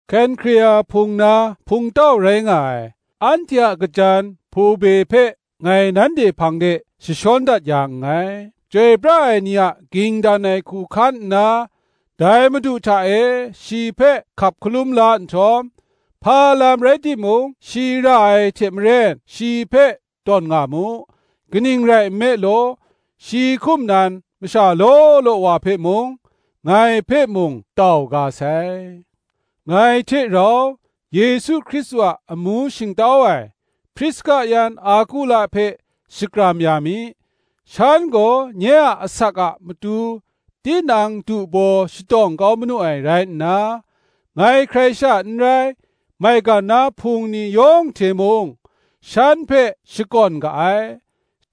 Kenhkrea hpung na hpungtau rai nga ai anhte a kajan Hpobe hpe ngai nanhte hpang de jashawn dat ya nngai: chyoi pra ai ni a ging dan ai hku hkan nna, dai Madu hta e shi hpe hkap hkalum la nhtawm, hpa lam rai timung shi ra ai hte maren, shi hpe tawn nga mu; kaning rai nme law, shi hkum nan masha law law wa hpe mung, ngai hpe mung, tau ga sai. Ngai hte rau Yesu Hkristu a amu shingtau ai Priska yan Akula hpe shakram ya mi; shan gaw nye a asak a matu tinang du baw shatawng kau manu ai rai nna, ngai hkrai sha n rai, maigan na Hpung ni yawng hte mung, shan hpe shakawn ga ai: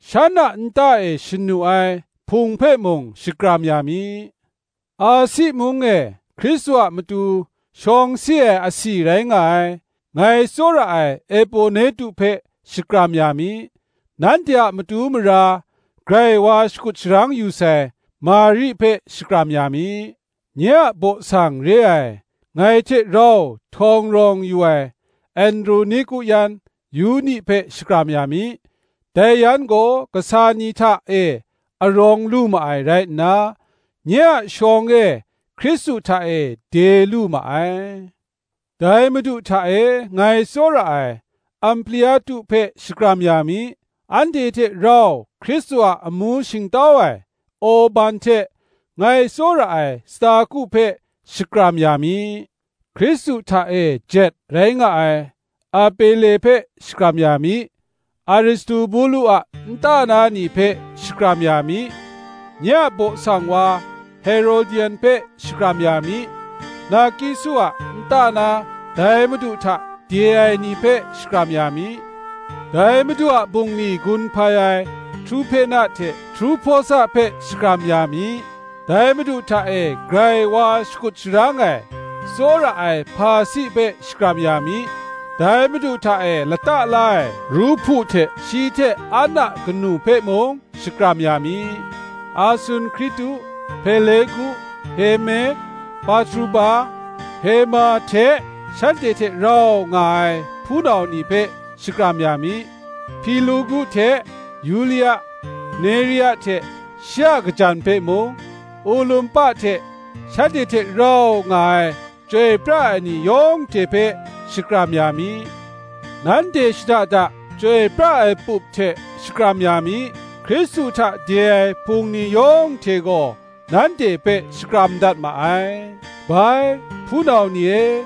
shan a nta e shanu ai Hpung hpe mung shakram ya mi. Asi mung e Hkristu a matu shawng si ai asi rai nga ai, ngai tsawra ai Eponetu hpe shakram ya mi. Nanhte a matu mara grai wa shakut sharang yu sai Mari hpe shakram ya mi. Nye a baw sang re ai, ngai hte rau htawng rawng yu ai Androniku yan Yuni hpe shakram ya mi: dai yan gaw kasa ni hta e arawng lu ma ai rai nna, nye a shawng e Hkristu hta e de lu ma ai. Dai Madu hta e ngai tsawra ai Ampliatu hpe shakram ya mi. Anhte hte rau Hkristu a amu shingtau ai Orban hte, ngai tsawra ai Staku hpe shakram ya mi. Hkristu hta e jet rai nga ai Apele hpe shakram ya mi. Aristobulu a nta na ni hpe shakram ya mi. Nye a baw sang wa Herodion hpe shakram ya mi. Narkiso a nta na dai Madu hta de ai ni hpe shakram ya mi. Dai Madu a bungli gun hpai ai Truhpena hte Truhpawsa hpe shakram ya mi. Dai Madu hta e grai wa shakut sharang ai, tsawra ai Persi hpe shakram ya mi. Dai Madu hta e lata la ai Ruhpu hte, shi hte an a kanu hpe mung shakram ya mi. Asunkritu, Hpelegu, Herme, Patroba, Herma hte, shanhte hte rau nga ai hpunau ni hpe shakram ya mi. Hpilogu hte Yulia, Nerea hte shi a kajan hpe mung, Olumpa hte shanhte hte rau nga ai chyoi pra ai ni yawng hte hpe shakram ya mi. Nanhte shada da chyoi pra ai pup hte shakram ya mi. Hkristu hta de ai Hpung ni yawng hte gaw, nanhte hpe shakram dat ma ai. Bai, hpunau ni e,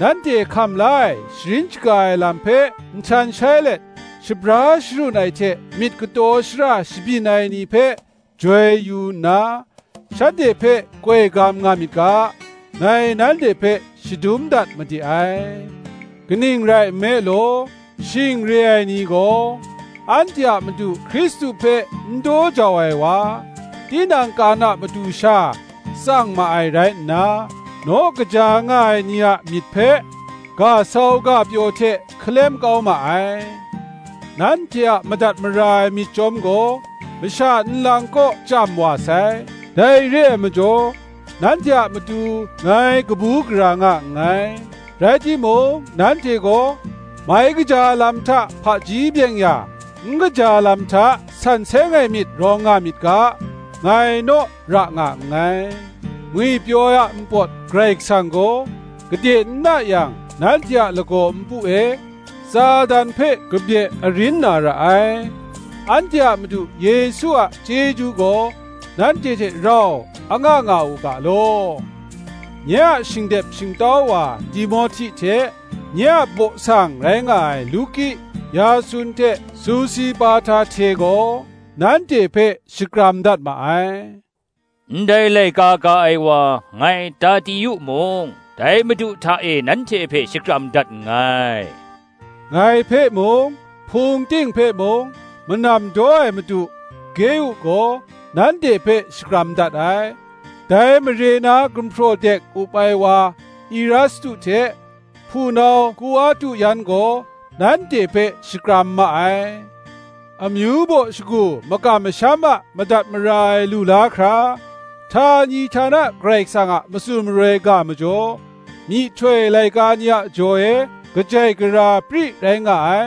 nanhte hkam la ai sharin shaga ai lam hpe nhtan shai let, shabra sharun ai hte myit kataw shara shabyin ai ni hpe joi yu nna, shanhte hpe koi gam nga myit ga, ngai nanhte hpe shadum dat made ai. Kaning rai nme law, shing re ai ni gaw, anhte a Madu Hkristu hpe n daw jau ai wa, tinang kan a matu sha tsang ma ai rai nna, naw kaja nga ai ni a myit hpe ga sau ga pyaw hte hkalem kau ma ai. Nanhte a madat mara ai myit chyawm gaw masha nlang kaw chyam wa sai: dai re ai majaw nanhte a matu ngai kabu gara nga nngai; rai timung, nanhte gaw mai kaja lam hta hpaji byeng-ya, n kaja lam hta san seng ai myit rawng nga myit ga, ngai naw ra nga nngai. Ngwipyaw ai a npawt Karai Kasang gaw, gade n na yang, nanhte a lagaw npu e Satan hpe kabye arin na ra ai. Anhte a Madu Yesu a chyeju gaw nanhte hte rau anga nga u ga law, Nye a shingdep shingtau wa Timohti hte, nye a baw sang rai nga ai Luki, Yasun hte Sosipata hte gaw nanhte hpe shakram dat ma ai. Ndai laika ka ai wa, ngai Tertiu mung, dai Madu hta e nanhte hpe shakram dat nngai. Ngai hpe mung, Hpung ting hpe mung, manam daw ai madu Geu gaw nanhte hpe shakram dat ai. Dai mare na gumhpraw dek up ai wa Erastu hte, hpunau Kuartu yan gaw nanhte hpe shakram ma ai. Amyu baw shagu makam masham a madat mara ai lu la hkra, htani htana Karai Kasang a matsun maroi ga majaw, myihtoi laika ni a jaw e kajai gara pri rai nga ai,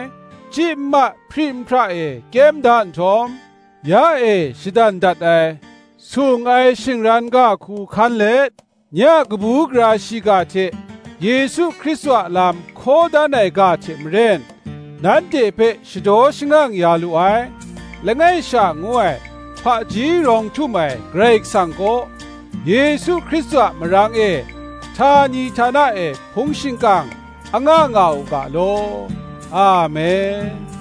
chyi nma hpri nhpra e kyem da nhtawm, ya e shadan dat ai sung ai shingran ga hku hkan let, nye a kabu gara shiga hte, Yesu Hkristu a lam hkaw dan ai ga hte maren, nanhte hpe shadaw shangang ya lu ai, langai sha ngu ai, hpaji rawng htum ai Karai Kasang kaw, Yesu Hkristu a marang e, htani htana e hpung shingkang anga nga u ga law. Amen.